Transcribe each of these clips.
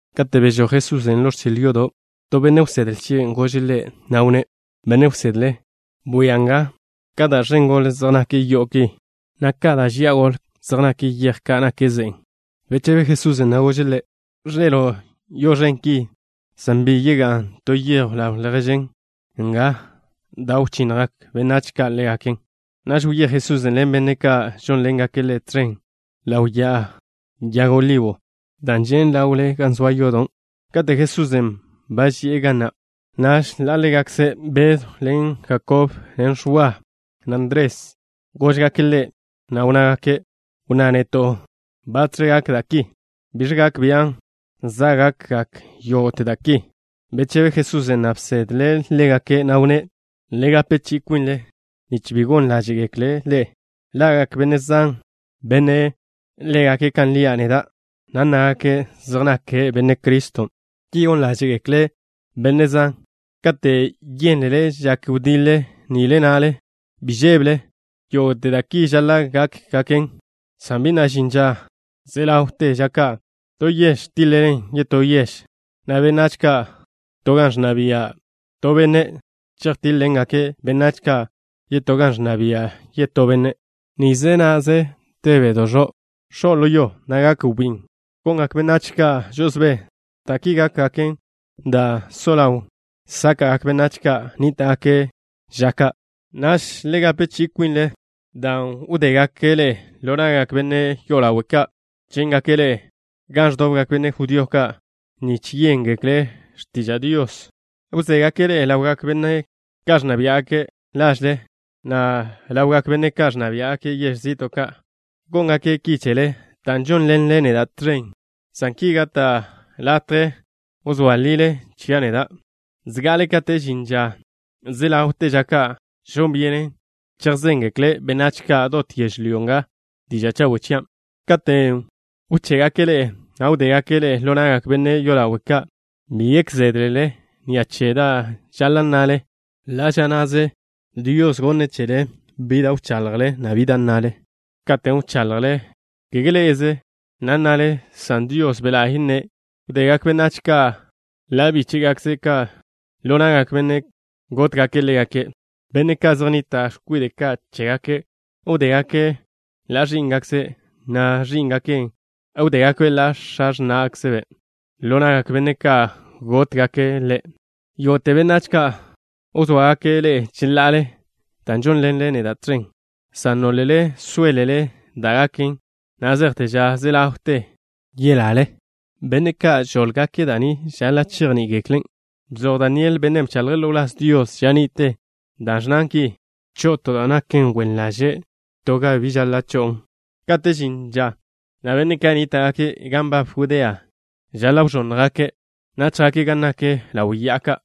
Kate' bežój Jesusen' ḻo ẕchil yodo', to benne' wsedle chie' gože' Ḻe', na' wnné': —Benne' wsedle, bwia nga ka ẕen gole zej nak yo'o ki, na' ka ẕen gole zej nak yej ka' zej žian ḻe'e ze'e chégaken. Bechebe Jesusen', na' gože' ḻe': —Ẕḻe'elo' yo'o ẕen ki, san bi ga'n to yej ḻaw lježen nga, dan' wchinnjgak benách ka' ḻégaken. Naž wyéj Jesusen' ḻen benne' ka' žónḻengake' Ḻe' tẕen ḻaw Ya'a Yag Olibo, da' žen' ḻawle gan de yodo'. Kate' Jesusen' ba ži'e ga na', naž ḻa' ḻégakze Bedw ḻen Jakob, na' Ẕwa, na' Ndres, góžgake' Ḻe', na' wnnágake': —Wnná neto' batx̱ gak da' ki. ¿Biẕ gak bian' za' gakgak yógo'te da' ki? Bechebe Jesusen', na' bsedle' ḻégake', na' wnné': —Le gape chi'i kwinle nich bi gon ḻáže'gekle' ḻe'e. Ḻa'gak benne' zan, benne' légake' kan lia' neda', na' nnágake' zej nake' Benne' Criston'. Ki gon ḻáže'gekle' benne' zan. ’Kate' yénlele žak wdiḻe nile na'le, bi žébele. Yógo'te da' ki žaḻa' gákgaken, san bi na' žin ža ze ḻawte ža ka'. To yež tiḻ-ḻen yetó yež, na' benách ka' to gan ẕnna bia' to benne' chejtíḻ-ḻengake' benách ka' yetó gan ẕnna bia' yetó benne'. Da' zan latje x̱o' ḻo yo, na' gak wbín. Gongak benách ka' žo'osbé. Da' ki gákgaken da' so ḻaw sáka'gak benách ka' nníta'gake' ža ka'. ’Naž le gape chi'i kwinle, dan' wdégake' ḻe'e ḻo na'gak benne' yolawe' ka'. Chíngake' ḻe'e gan ẕdobgak benne' judío ka' nich yéngekle' x̱tiža' Dios. Wzégake' ḻe'e ḻawgak benne' ka' ẕnna biá'gake' lažle, na' ḻawgak benne' ka' ẕnna biá'gake' yež zi'to' ka'. Góngake' ki chele dan' žónḻenle neda' tẕen, san ki gata' latje wzóa lile chia' neda'. Zga'ale kate' žin ža ze ḻawte ža ka' žon byenen chejzéngekle' benách ka' dot yežlyó nga diža' chawe' chian'. Katen' wché'gake' ḻe'e, na' wdégake' ḻe'e ḻo na'gak benne' yolawe' ka', bi gek zédlele ni'a che da' žaḻa' nnale. Ḻa' ža na'ze Dios wneẕjwe' chele da' wchaḻjle, na' dan' nnale. Katen' wchaḻjle, kege ḻé'ezele na' nnale, san Dios Be' La'y nne'. Wdegak benách ka' ḻa' bíche'gakkze' ka' ḻo na'gak benne' ka' gótgake' ḻégake'. Benne' ka' zej nnita' x̱kwide' ka' chégake' wdégake' ḻa' ẕí'ngakkze', na' ẕí'ngake' ka' wdégakbe' ḻa' x̱a x̱ná'gakkzbe' ka' ḻo na'gak benne' ka' gótgake' ḻégake'. Yógo'te benách ka' wzóagake' ḻe'e cheḻa'ale dan' žónḻenle neda' tẕen, san nólele sóelele da' gaken na' zejte ža ze ḻawte ža, yelale. ’Benne' ka' žóḻgake' da' ni žaḻa' chejní'igeklen'. Bzoj Daniel, bennen' bchaḻje' ḻo wláz Dios ža ni'te, da' ẕnnan ki: “Cho'o to da' naken x̱iwe' da' yesniten gan bi žaḻa' cho'on.” Kate' žin ža na', benne' ka' nníta'gake' gan nbab Judea žaḻa' wẕónnjgake', na' chjake' gan nak ḻaw ya'a ka'.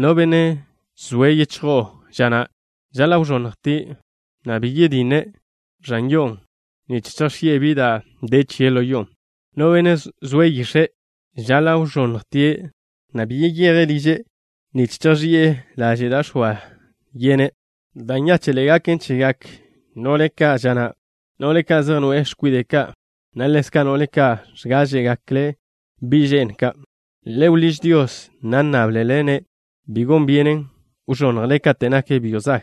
No benne' zoe' yichjo'o ža na' žaḻa' wẕónnjtie', na' bi yetje' ẕan yo'o nich chejx̱i'e bi da' de chie' ḻo yo'on'. No benne' zoe' yix̱e' žaḻa' wẕónnjtie', na' bi yeyeje' liže' nich chejx̱i'e laže' da' x̱oa yene'. Da' nyáche'ḻe'e gaken chegak no'le ka' ža na', no'le ka' zej noe'e x̱kwide' ka', na' ḻezka' no'le ka' ẕgáẕe'gekle' bi' že'n ka'. Le wḻíž Dios, na' nnáblele-ne' bi gon byenen wẕonnjle kate' nak byo' zag.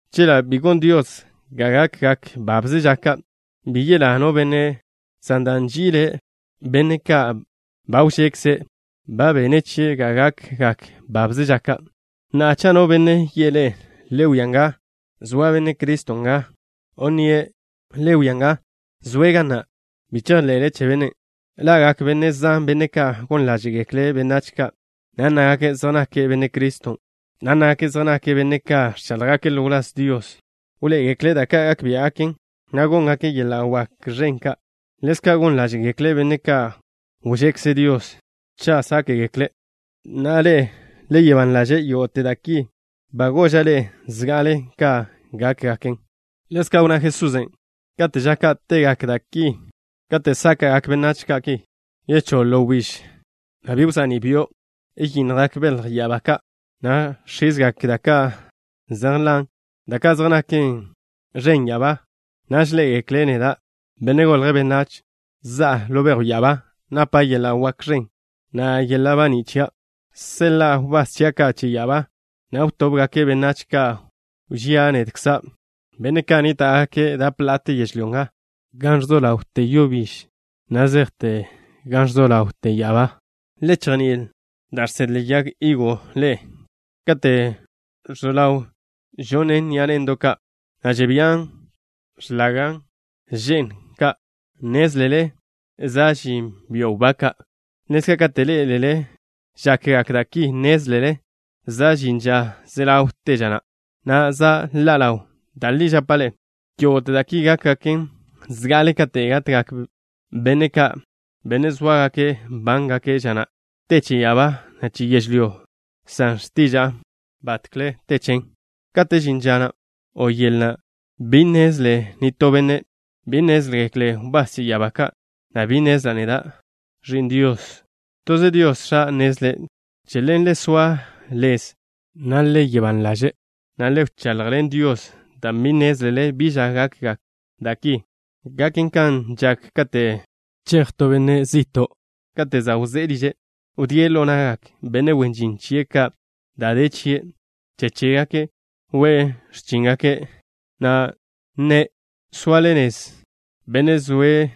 Chela' bi gon Dios ga gakgak babze ža ka', bi yelá no benne', san dan' nži'ile' benne' ka' ba wžekze', ba bene' chie' gone' ga gakgak babze ža ka'. ’Na'a, cha' no benne' yi'e ḻe'e: “Le wia nga, zoa Benne' Criston' nga” o nnie': “Le wia nga zoe' ga na'” bi chejḻe'le che bennen'. Ḻa'gak benne' zan, benne' ka' gon ḻáže'gekle' benách ka', na' nnágake' zej nake' Benne' Criston', na' nnágake' zej nake' benne' ka' ẕcháḻjgake' ḻo wláz Dios. Wḻoé'egekle' da' ka' gak biá'gaken, na' góngake' yeḻa' wak ẕen ka'. Ḻezka' gon ḻáže'gekle' benne' ka' wžekze Dios cha' sáke'gekle'. Na'a ḻe'e, le soa ban ḻaže'. Yógo'te da' ki ba goža' ḻe'e zga'ale ka gákgaken. Ḻezka' wnná Jesusen': —Kate' ža ka', te gak da' ki, kate' sáka'gak benách ka' ki, choḻ wbíž, na' bi cha'ní' byo'. Yinnjgak belj ya'abá ka', na' x̱izgak da' ka' zej nḻan', da' ka' zej naken ẕen ya'abán'. Naž ḻé'egekle' neda', Benne' Golje' Benách, za'a ḻo bejw ya'abá, napa' yeḻa' wak ẕen, na' yeḻa' baní' chia'. Seḻa'a wbás chia' ka' che ya'abá, na' wtóbgake' benách ka' wžía' nedkza', benne' ka' nníta'gake' dap ḻa'ate yežlyó nga, gan so ḻawte yo biž, na' zejte gan so ḻawte ya'abá. ’Le chejní'il da' žsedle yag higo ḻe'e. Kate' so ḻaw gonen ni'a ne'ndo' ka', na' žebían x̱lage' že'ndo' ka', nnézlele za' žin byo' wbá ka'. Ḻezka', kate' ḻé'elele žakgak da' ki, nnézlele za' žin ža ze ḻawte ža na', na' za' ḻa' ḻawn. Da' li žapa' ḻe'e, yógo'te da' ki gákgaken zga'ale kate' gatgak benne' ka', benne' sóagake' nbángake' ža na'. Te che ya'abá, na' che yežlyó nga, san x̱tiža'a batkle te chen. ’Kate' žin ža na' o yel na', bi nnezle nitó benne'. Bi nnézgekle wbás che ya'abá ka', na' bi nnezla' neda', Ẕi'n Dios. Toze Dios X̱a' nnezlen'. Che ḻen, le soa lez, na' le soa ban ḻaže', na' le wchaḻjḻen Dios dan' bi nnézlele bi ža gakgak da' ki. Gaken kan žak kate' chej to benne' zi'to'. Kate' za' wzé'e liže', wdíe' ḻo na'gak benne' wen žin chie' ka' da' de chie'. Che chégake' we'e x̱chíngake', na' nne' soa lez benne' zoe'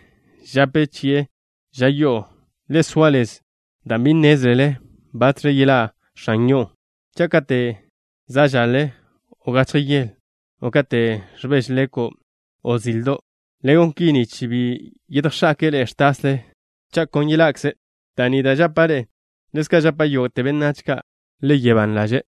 žape chi'e ža yo'o. Le soa lez dan' bi nnézlele batx̱ yeḻá' x̱an yo'o, cha' kate' za' žaḻe, o gachje yele, o kate' ẕbeže leko', o zildo'. Le gon ki, nich bi yedjx̱ake'e ḻe'e ẕtasle cha' kon yeḻa'kze'. Da' ni da' žapa' ḻe'e, ḻezka' žapa' yógo'te benách: le soa ban ḻaže'.